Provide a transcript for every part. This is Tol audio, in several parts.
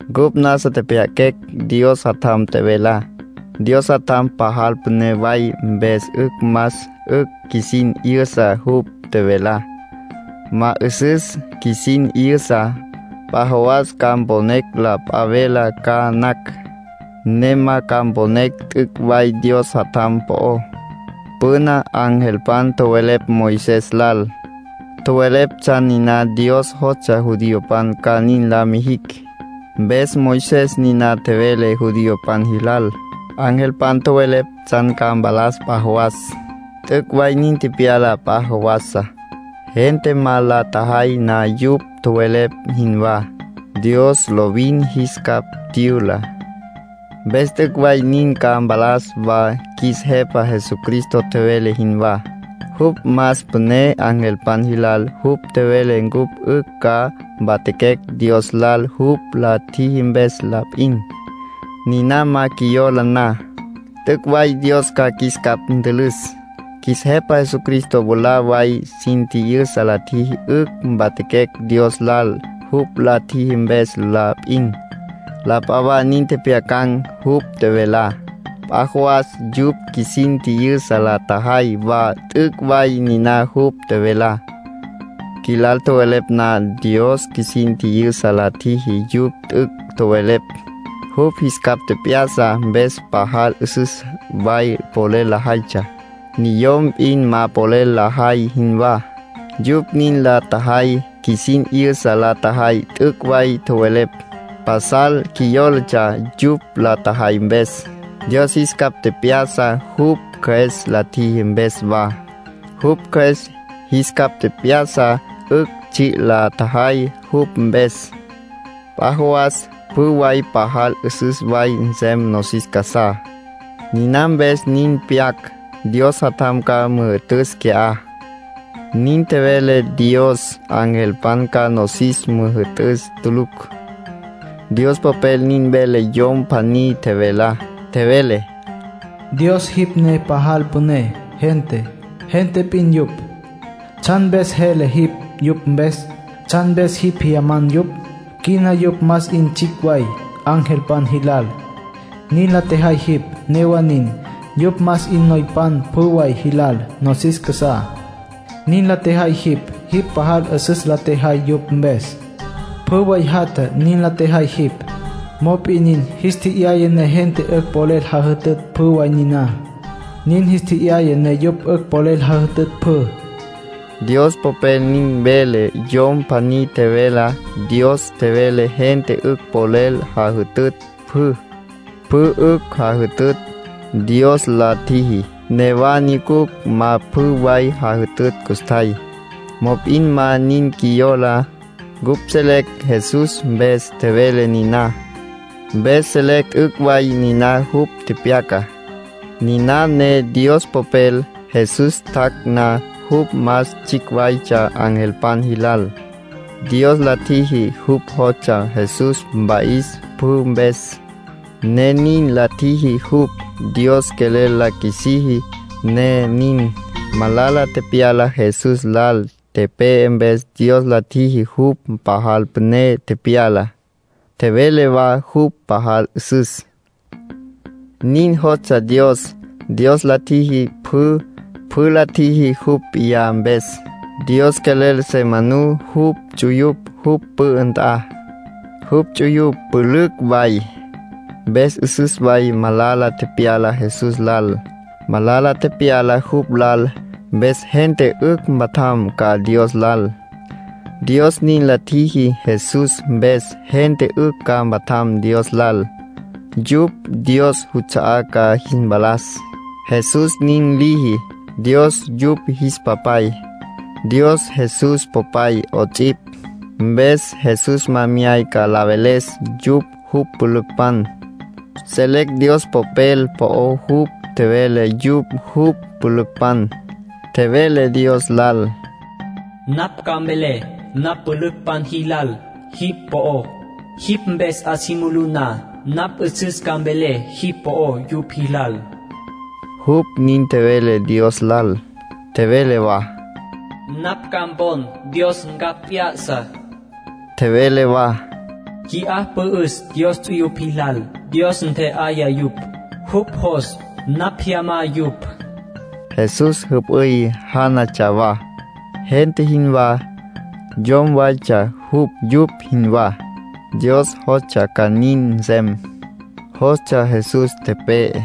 Cupj nasa tjepjya'aquecj Dios Jatjam tjevelá. Dios Jatjam pajal püné way, mpes 'ücj más 'ücj qjuisin 'yüsa jupj tjevelá. Ma 'üsüs qjuisin 'yüsa, p'a jawas ca mponecj la p'a velá ca nacj, ne ma ca mponecj t'üc' way Dios Jatjam po'ó. Püna angelpan tjowelepj Moisés lal. Tjowelepj tsjan niná Dios jostsja judiopan ca nin la mijicj. Mpes Moisés niná tjevele judiopan jilal. Angelpan tjowelepj tsjan ca mpalas p'a jawas. T'üc' way nin tepyala p'a jawasá. Gente ma la tjajay na yupj tjowelepj jinwá, Dios lovin jis capj tyüla. Mpes t'üc' way nin ca mpalas wa qjuis Jepa Jesucristo tjevele jinwá; jupj más püné angelpan jilal. Jupj tjevele cupj 'ücj ca mpatjaquecj Dios lal jupj la tjiji mpes la p'in. Niná ma qjuiyola na, t'üc' way Dios ca qjuis capj ntülüs. Qjuis Jepa Jesucristo mwalá way sin tji'yüsa la tjiji 'ücj mpatjaquecj Dios lal jupj la tjiji mpes la p'in. La p'a wa nin tjepjyacan̈ jupj tjevelá, p'a jawas yupj qjuisin tji'yüsa la tjajay wa t'üc' way niná jupj tjevelá. Qjuilal tjowelepj na, Dios qjuisin tji'yüsa la tjiji yupj t'üc' tjowelepj. Jupj jis capj tjep'ya'sa mpes pajal 'üsüs way polel lajaytsja, niyom p'in ma polel lajay jinwá. Yupj nin la tjajay qjuisin 'yüsa la tjajay t'üc' way tjowelepj. Pasal qjuiyólatsja yupj la tjajay mpes. Dios jis capj tjep'ya'sa jupj Cjües la tjiji mpes wa. Jupj Cjües jis capj tjep'ya'sa 'ücj tsji' la tjajay jupj mpes. P'a jawas pjü way pajal 'üsüs way nsem nosis casá. Niná mpes nin pyac. Dios Jatjam ca müjü'tüs qui'á, nin tjevele Dios. Angelpan ca nosis müjü'tücj tulucj. Dios Popel nin vele yom pjaní tjevelá. Tjevele: “Dios, jipj ne pajal püné. Gente, gente p'in yupj. ¿Tsjan mpes jele jipj yupj mpes? ¿Tsjan mpes jipj jyaman yupj? Quina yupj más 'in tsjicj way angelpan jilal, nin la tjejay jipj. Newa nin, yupj más 'in noypan pjü way jilal nosis casá, nin la tjejay jipj. Jipj pajal 'üsüs la tjejay yupj mpes. Pjü way jatja, nin la tjejay jipj. Mop'in nin jis tje'yaya ne gente 'ücj polel jajütütj pjü way niná. Nin jis tje'yaya ne yupj 'ücj polel jajütütj pjü.” Dios Popel nin vele yom pjaní tjevelá. Dios tjevele gente 'ücj polel jajütütj pjü. Pjü 'ücj jajütütj, Dios la tjiji. Newa nyucucj ma pjü way jajütütj custjay. Mop'in ma nin qjuiyola. Cupj selecj Jesús mpes tjevele niná. Mpes selecj t'üc' way niná jupj tepyacá, niná ne Dios Popel. Jesús tjac' na, jupj más tsjicj waytsja angelpan jilal, Dios la tjiji. Jupj jostsja Jesús mpa'is pjü mpes, ne nin la tjiji jupj. Dios quelel la qjuisiji, ne nin. Malala tepyala Jesús lal, tepe'e, mpes Dios la tjiji jupj pajal püné tepyala, tjevele wa jupj pajal 'üsüs. Nin jostsja Dios. Dios la tjiji pjü; pjü la tjiji jupj p'iyá mpes. Dios quelel se manú jupj ts'uyupj jupj pü'ü nt'a, jupj ts'uyupj pülücj way. Mpes 'üsüs way malala tepyala Jesús lal. Malala tepyala jupj lal, mpes gente 'ücj mpatjam ca Dios lal, Dios nin la tjiji. Jesús mpes gente 'ücj ca mpatjam Dios lal. Yupj Dios juts'a'á ca jis mpalas, Jesús nin liji. Dios yupj jis Papay. Dios Jesús Popay 'ots'ipj. Mpes Jesús ma myayca la veles yupj jupj pülücpan. Selecj Dios Popel po'ó jupj tjevele yupj jupj pülücpan. Tjevele Dios lal: “Napj ca mvelé napj mpülücpan jilal jipj po'ó. Jipj mpes 'a si mulú na, napj 'üsüs ca mvelé jipj po'ó yupj jilal”, jupj nin tjevele Dios lal. Tjevele wa: “Napj ca mpon Dios ncapj p'ya'sa”. Tjevele wa: “Qui'á pü'üs Dios ts'uyupj jilal. Dios ntje'aya yupj; jupj jos napj jyamá yupj.” Jesús jüp'üy jánatsja wa, gente jinwá. Yom waytsja jupj yupj jinwá. Dios jostsja ca nin nsem; jostsja Jesús tepe'e,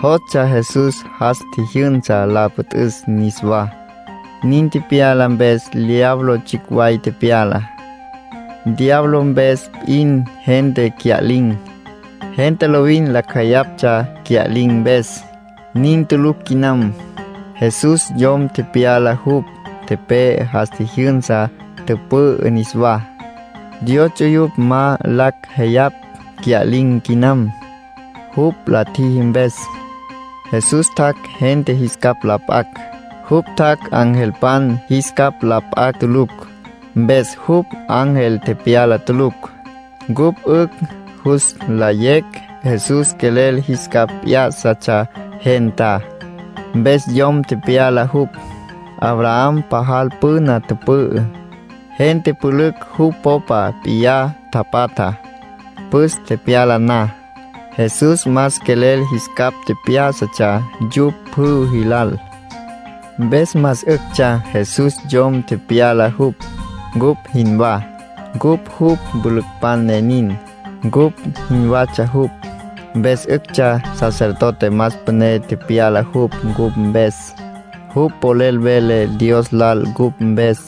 jostsja Jesús jas tjijyünsa la püt'üs niswá. Nin tepyala mpes, diablo tsjicj way tepyala. Diablo mpes p'in gente cya'lin̈. Gente lovin lacj jeyaptsja cya'lin̈ mpes. Nin tulucj quinam. Jesús yom tepyala jupj, tepe'e, jas tjijyünsa, tüpü'ü niswá. Dios ts'uyupj ma lacj jeyapj cya'lin̈ quinam, jupj la tjiji mpes. Jesús tjac' gente jis capj la p'acj. Jupj tjac' angelpan jis capj la p'acj tulucj. Mpes jupj ángel tepyala tulucj. Cupj 'ücj jus nlayecj Jesús quelel jis capj p'yá'satsja gentá, mpes yom tepyala jupj. Abraham pajal püna tüpü'ü, gente pülücj jupj popa p'iyá tapatja, püs tepyala na. Jesús más quelel jis capj tjep'yá'satsja yupj pjü jilal. Mpes más 'üctsja Jesús yom tepyala jupj, cupj jinwá. Cupj jupj pülücpan ne nin. Cupj jinwatsja jupj, mpes 'üctsja sacerdote más püné tepyala jupj cupj mpes; jupj polel vele Dios lal cupj mpes.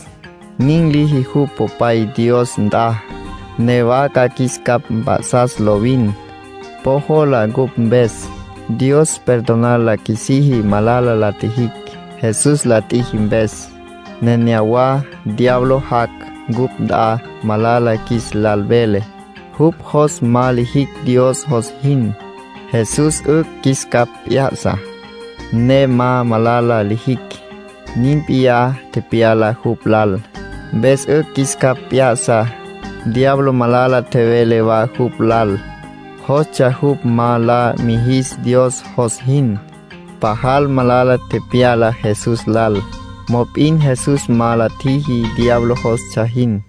Nin liji jupj Popay Dios nt'a. Newa ca qjuis capj mp'a'sas lovin. Po jola cupj mpes. Dios perdonar la qjuisiji malala la tjijicj, Jesús la tjiji mpes. Nenéyawa diablo jac' cupj nt'a, malala qjuis lal vele; jupj jos ma lijicj Dios jos jin. Jesús 'ücj qjuis capj p'ya'sa, ne ma malala lijicj. Nin p'iyá tepyala jupj lal, mpes 'ücj qjuis capj p'ya'sa. Diablo malala tjevele wa jupj lal, jostsja jupj ma la mijis Dios jos jin. Pajal malala tepyala Jesús lal. Mop'in Jesús ma la tjiji diablo jostsja jin.